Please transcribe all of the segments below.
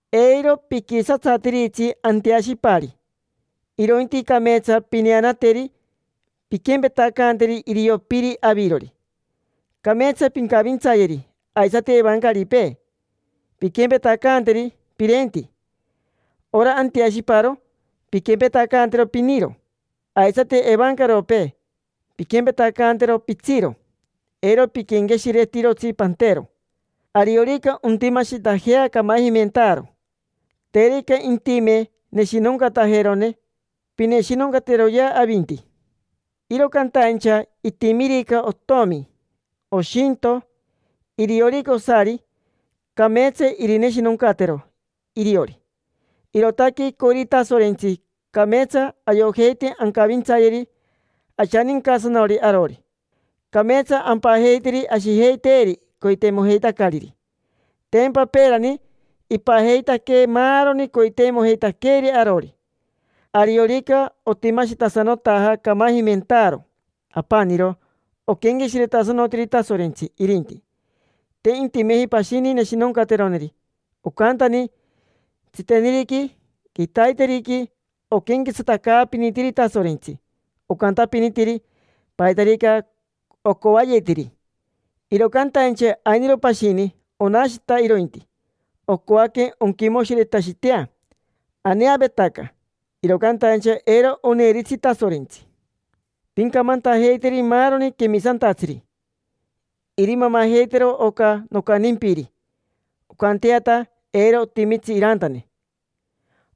Eiro piquisatsatiritsi anteashipari; irointi cameetsa pineanateri, pinquempetacanteri irio piri avirori, cameetsa pincavintsayeri. Aisati evancaripee, pinquempetacanteri pirenti. Ora anteashiparo, pinquempetacantero piniro. Aisati evancaropee, pinquempetacantero pitsiro: eiro piquenqueshiretirotsi pantero. Ariorica ontimashitajea camajimentaaro, terica intime neshinoncatajerone, pineshinoncateroyea avinti. Iro cantaincha itimirica otomi, oshinto, iriorica osari, cameetsa irineshinoncatero iriori. Irootaque icoiri Tasorentsi cameetsa ayojeite ancavintsayeri ashanincasanori arori. Cameetsa ampajeiteri ashijeiteeri coiteimojeitacariri. Tempa peerani ipajeitaquee maaroni coiteimojeitaqueeri arori. Ariorica otimashitasanotaja camajimentaaro, apaniro oquenqueshiretasanotiri Tasorentsi irinti, te intimeji pashini neshinoncateroneri. Ocantani: tsiteniriqui, quitaiteriqui, oquenquetsatacaapinitiri Tasorentsi, ocantapinitiri paitarica ocoayetiri. Iro cantaincha ainiro pashini, onashita irointi: ocoaque onquimoshiretashitea. Aneavetaca, iro cantaincha eiro oneiritsi Tasorentsi. Pincamantajeiteri maaroni quemisantatsiri irimamajeitero oca nocantimpiri, oncanteata eiro otimitsi irantane.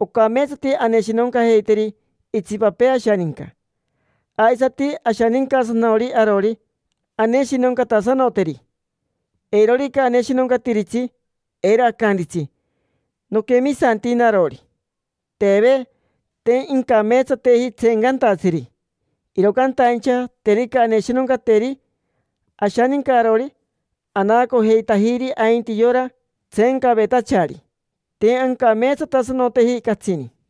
Ocameetsati aneshinoncajeiteri itsipapee ashaninca, aisati ashanincasanori arori, aneshinoncatasanoteri. Eirorica aneshinoncatiritsi, eiro acantitsi: “Noquemisanti narori”. Teve. Te incameetsateji tseencantatsiri, iro cantaincha terica aneshinoncateri ashaninca arori, anaacojeitajiri ainti yora tseencavetachari, te ancameetsatasanoteji catsini.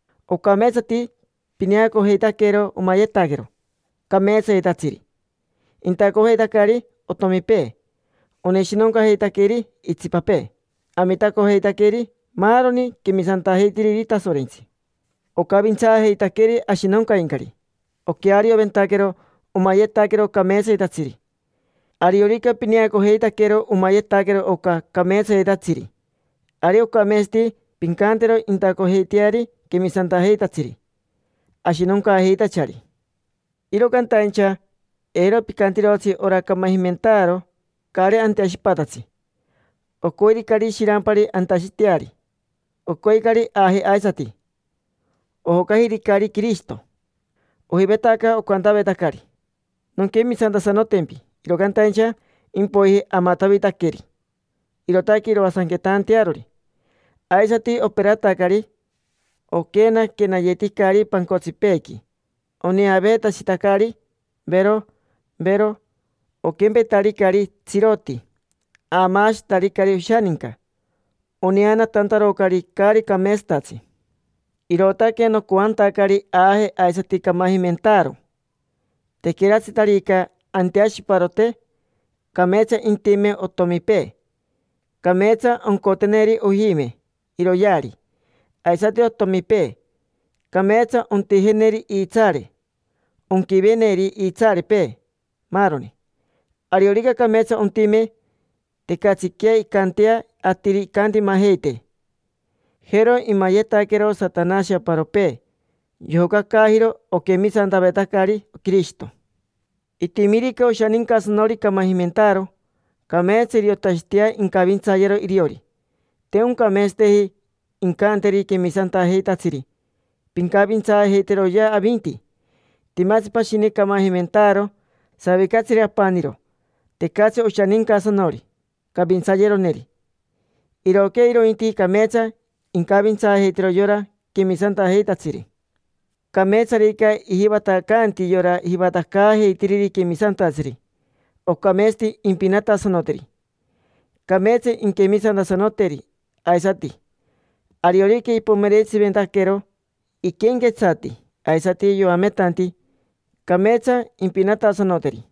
Ocameetsati pineacojeitaquero omayetaquero cameetsayetatsiri: intacojeitacari otomipee, oneshinoncajeitaqueri itsipapee, amitacojeitaqueri maaroni quemisantajeitiriri Tasorentsi, ocavintsaajeitaqueri ashinoncaincari, oquearioventaquero omayetaquero cameetsayetatsiri. Ariorica pineacojeitaquero omayetaquero oca cameetsayetatsiri, ari ocameetsati pincantero intacojeiteari quemisantajeitatsiri ashinoncaajeitachari. Iro cantaincha eiro picantirotsi ora camajimentaaro caari anteashipatatsi. Ocoiricari shirampari antashiteari. Ocoicari aaje aisati, ojocajiricari Quirishito. Ojivavetaca ocantavetacari: “Nonquemisantasanotempi”, iro cantaincha impoiji amatavitaqueri. Irootaque iroasanquetantearori. Aisati operatacari, oquenaquenayeticari pancotsipeequi, oneaveetashitacari, vero, vero, oquempetaricari tsiroti. Aamaashitaricari oshaninca, oneanatantarocari caari cameetsatatsi. Irootaque nocoantacari aaje aisati camajimentaaro, tequeratsitarica anteashiparote. Cameetsa intime otomipee. Cameetsa oncoteneri ojime iroyeari, aisati otomipee. Cameetsa ontijeneri iitsaare, onquiveneri iitsaarepee, maaroni. Ariorica cameetsa ontime, tecatsiquea incantea atiri incantimajeitee. Jero imayetaquero Satanashi aparopee: yojocacaajiro oquemisantavetacari Quirishito. Itimirica oshanincasanori camajimentaaro, cameetsa iriotashitea incavintsayero iriori. Te oncameetsateji incanteri quemisantajeitatsiri: “Pincavintsaajeiteroyea avinti”. Timatsi pashini camajimentaaro, savicatsiri apaniro: tecatsi oshanincasanori cavintsayeroneri. Irooquea irointi, cameetsa incavintsaajeitero yora quemisantajeitatsiri. Cameetsarica ijivatacanti yora jivatacaajeitiriri quemisantatsiri, ocameetsati impinatasanoteri. Cameetsa inquemisantasanoteri aisati. Ariorica ipomerentsiventaquero iquenquetsati aisati yoametanti, cameetsa impinatasanoteri.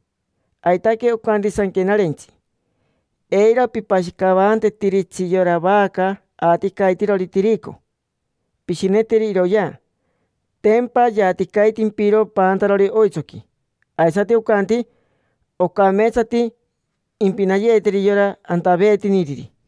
Aitaque ocanti Sanquenarentsi: “Eiro pipashicavantetiritsi yora vaca aaticaitirori tirico, pishineteri iroyea. Tempa yaaticaitimpiro paantarori oitsoqui”. Aisati ocanti: “Ocameetsati impinayeeteri yora antaveetiniriri”.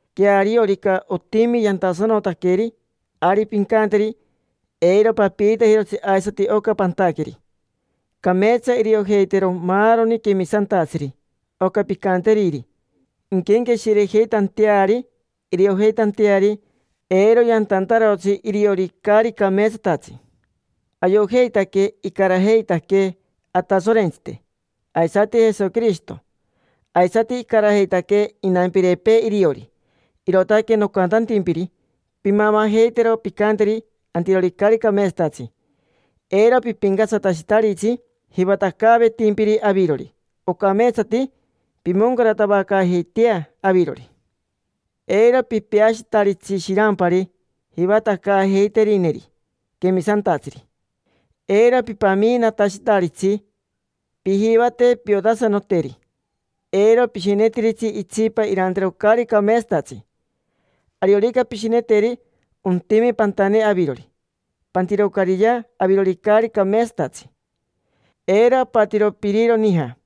Queariorica otimi yantasanotaqueri, ari pincanteri: “Eiro papiitajirotsi aisati oca pantaqueri”. Cameetsa iriojeitero maaroni quemisantatsiri oca pincanteriri, inquenqueshirejeitanteari, iriojeitanteari eiro yantantarotsi iriori caari cameetsatatsi. Ayojeitaque icarajeitaquee Atasorentsite, aisati Jesoquirishito. Aisati icarajeitaquee inampirepee iriori. Irootaque nocantantimpiri pimamajeitero pincanteri antirori caari cameetsatatsi. Eiro pipincatsatashitaritsi jivatacaavetimpiri avirori. Ocameetsati pimoncaratavacaajeitea avirori. Eiro pipeashitaritsi shirampari jivatacaajeiterineri quemisantatsiri, eiro pipamiinatashitaritsi. Pijivate piotasanoteri. Eiro pishinetiritsi itsipa irantero caari cameetsatatsi: ariorica pishineteri, ontime pantane avirori. Pantirocariya avirori caari cameetsatatsi. Eiro apatiro piriro nija,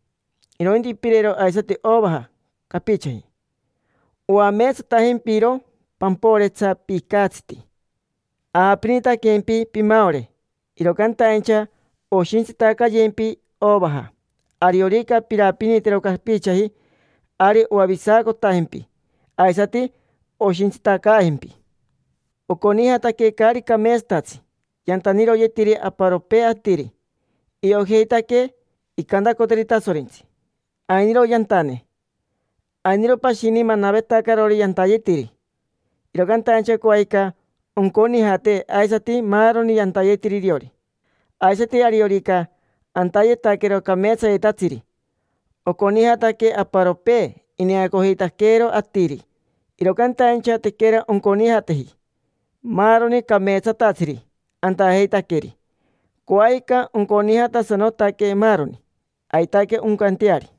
irointi pirero aisati ovaja capichaji. Oameetsatajempiro pamporetsa picatsiti. Aapinitaquempi pimaore, iro cantaincha oshintsitacayempi ovaja. Ariorica pirapinitero capichaji, ari oavisacotajempi, aisati oshintsitacaajempi. Oconijataque caari cameetsatatsi yantaniroyetiri aparopee atiri; iojeitaque incantacoteri Tasorentsi: “Ainiro yantane”. Ainiro pashini manavetacarori yantayetiri, iro cantaincha coajica onconijate aisati maaroni yantayetiri iriori. Aisati, ariorica antayetaquero cameetsayetatsiri, oconijataque aparopee, ineacojeitaqueero atiri. Iro cantaincha tequera onconijateji maaroni cameetsatatsiri antajeitaqueri: coajica onconijatasanotaque maaroni. Aitaque oncanteari.